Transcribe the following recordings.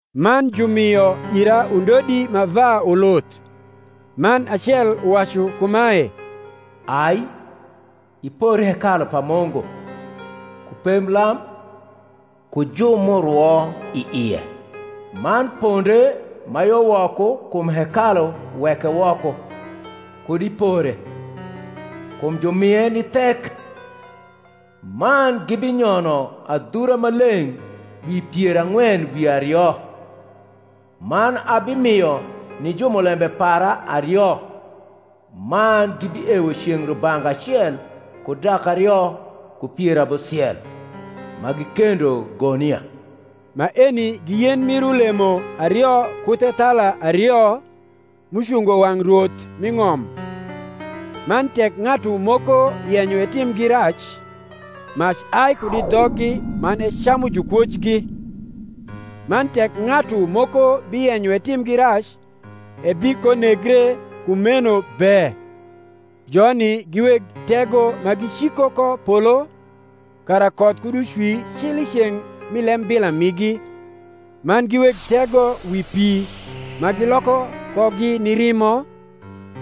Man jumio ira undodi ma va uluth: man acel uwacu kumae, Ai, ipor hekalu pa Mungu, ku pemblam, ku ju m’urwo i ie. Man ponde ma yo woko kum hekalu weke woko, kud ipore; kum jumie ni thek: man gibinyono adhura ma leng’ dwi pier ang’wen wi ario. Man abimio ni jumulembe para ario, man gibiewo ceng’ rubanga acel ku dak ario ku pier abusiel, ma gikendo gonia. Maeni gi yen mir ulemo ario ku thethala ario, m’ucungo wang’ Rwoth mi ng’om. Man tek ng’atu moko yenyo etimgi rac, mac ai kud i dhoggi man ecamu jukwojgi; man tek ng’atu moko biyenyo etimgi rac, ebikonegre kumeno be. Joni gi weg tego ma giciko ko polo, kara koth kud ucwi cil i ceng’ mi lembila migi: man gi weg tego wi pi ma giloko kogi ni rimo,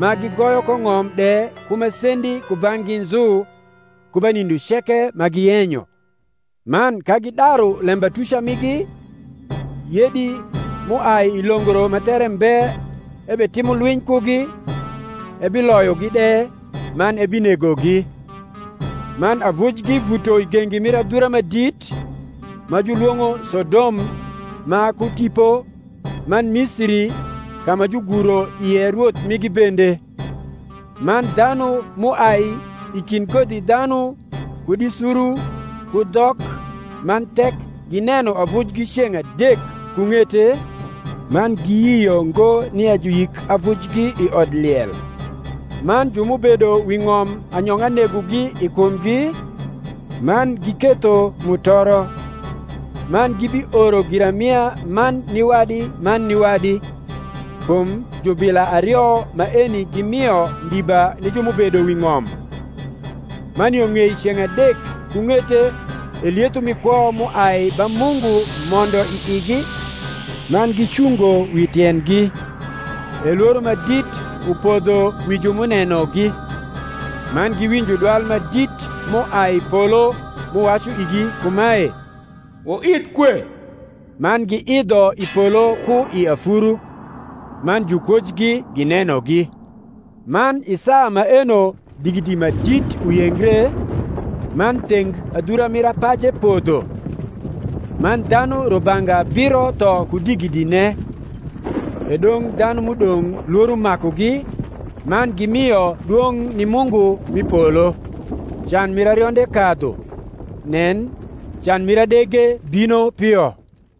ma gigoyo ko ng’om de ku masendi kubang’gi nzu, ku ba nindo ceke ma giyenyo. Man ka gibidaru lembatuca migi, yedi m’uai i longro ma there mbe ebitimo lwiny kugi, ebiloyogi de, man ebinegogi. Man avujgi vuto i gengi mir adhura ma dit, ma julwong’o Sodom ma ku tipo, man Misiri, ka ma juguro ie Rwoth migi bende. Man dhanu m’uai i kind kodhidhanu kud i suru ku dhok man thek gineno avujgi ceng’ adek ku ng’ete, man giyio ngo nia juyik avujgi i odliel. Man ju m’ubedo wi ng’om anyong’a negogi i kumgi, man giketho mutoro; man gibioro giramia man ni wadi man ni wadi; kum jubila ario maeni gimio ndiba ni ju m’ubedo wi ng’om. Man yo ng’ei ceng’ adek ku ng’ete e lietho mi kwo m’uai ba Mungu mondo i igi, man gicungo wi tiendgi; e lworo ma dit upodho wi ju m’unenogi. Man giwinjo dwal ma dit m’uai i polo m’uwacu igi kumae, Wnidh kue. Man giidho i polo ku i afuru; man jukwojgi ginenogi. Man i saa maeno digidi ma dit uyengre, man theng adhura mir apaje podho; man dhanu rubanga abiro tho ku digidine: e dong’ dhanu m’udong’ lworo makugi, man gimio dwong’ ni Mungu mi polo. Can mir arionde kadhu: nen, can mir adege bino pio.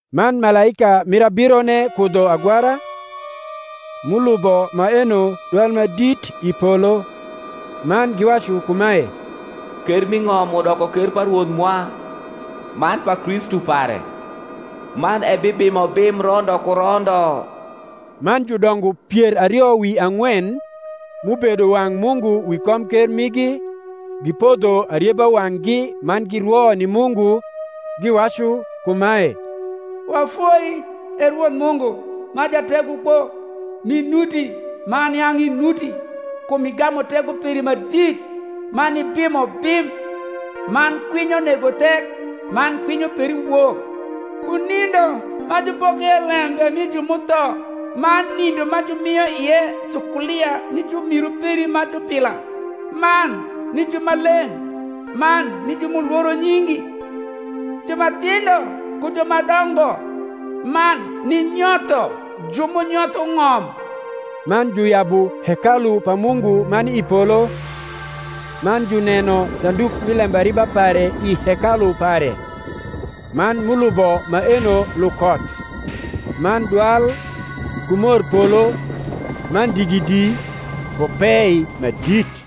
Man malaika mir abirone kudho agwara; m’ulubo maeno dwal ma dit i polo, man giwacu kumae, Ker m’i ng’om udoko ker pa Rwoth mwa, man pa Kristu pare: man ebibimo bim rondo ku rondo. Man judongo pier ario wi ang’wen, m’ubedo wang’ Mungu wi komker migi, gipodho arieba wang’gi man girwo ni Mungu, giwacu kumae, Wafoi, E Rwoth Mungu, ma Jategokpo, m’inuti man yang’ inuti; kum igamu tego peri ma dit, man ibimo bim. Man kwinyo nego thek man kwinyo peri wok, ku nindo ma jupoko ie lembe mi ju m’utho, man nindo ma jumio ie sukulia ni jumiru peri ma jubila, man ni jumaleng’, man ni ju m’ulworo nyingi, ju ma thindho ku ju ma dongo; man ninyotho ju m’unyotho ng’om. Man juyabu hekalu pa Mungu ma ni i polo; man juneno sanduk mi lembariba pare i hekalu pare; man m’ulubo maeno lukoth, man dwal, ku morpolo, man digidi, ku pei ma dit.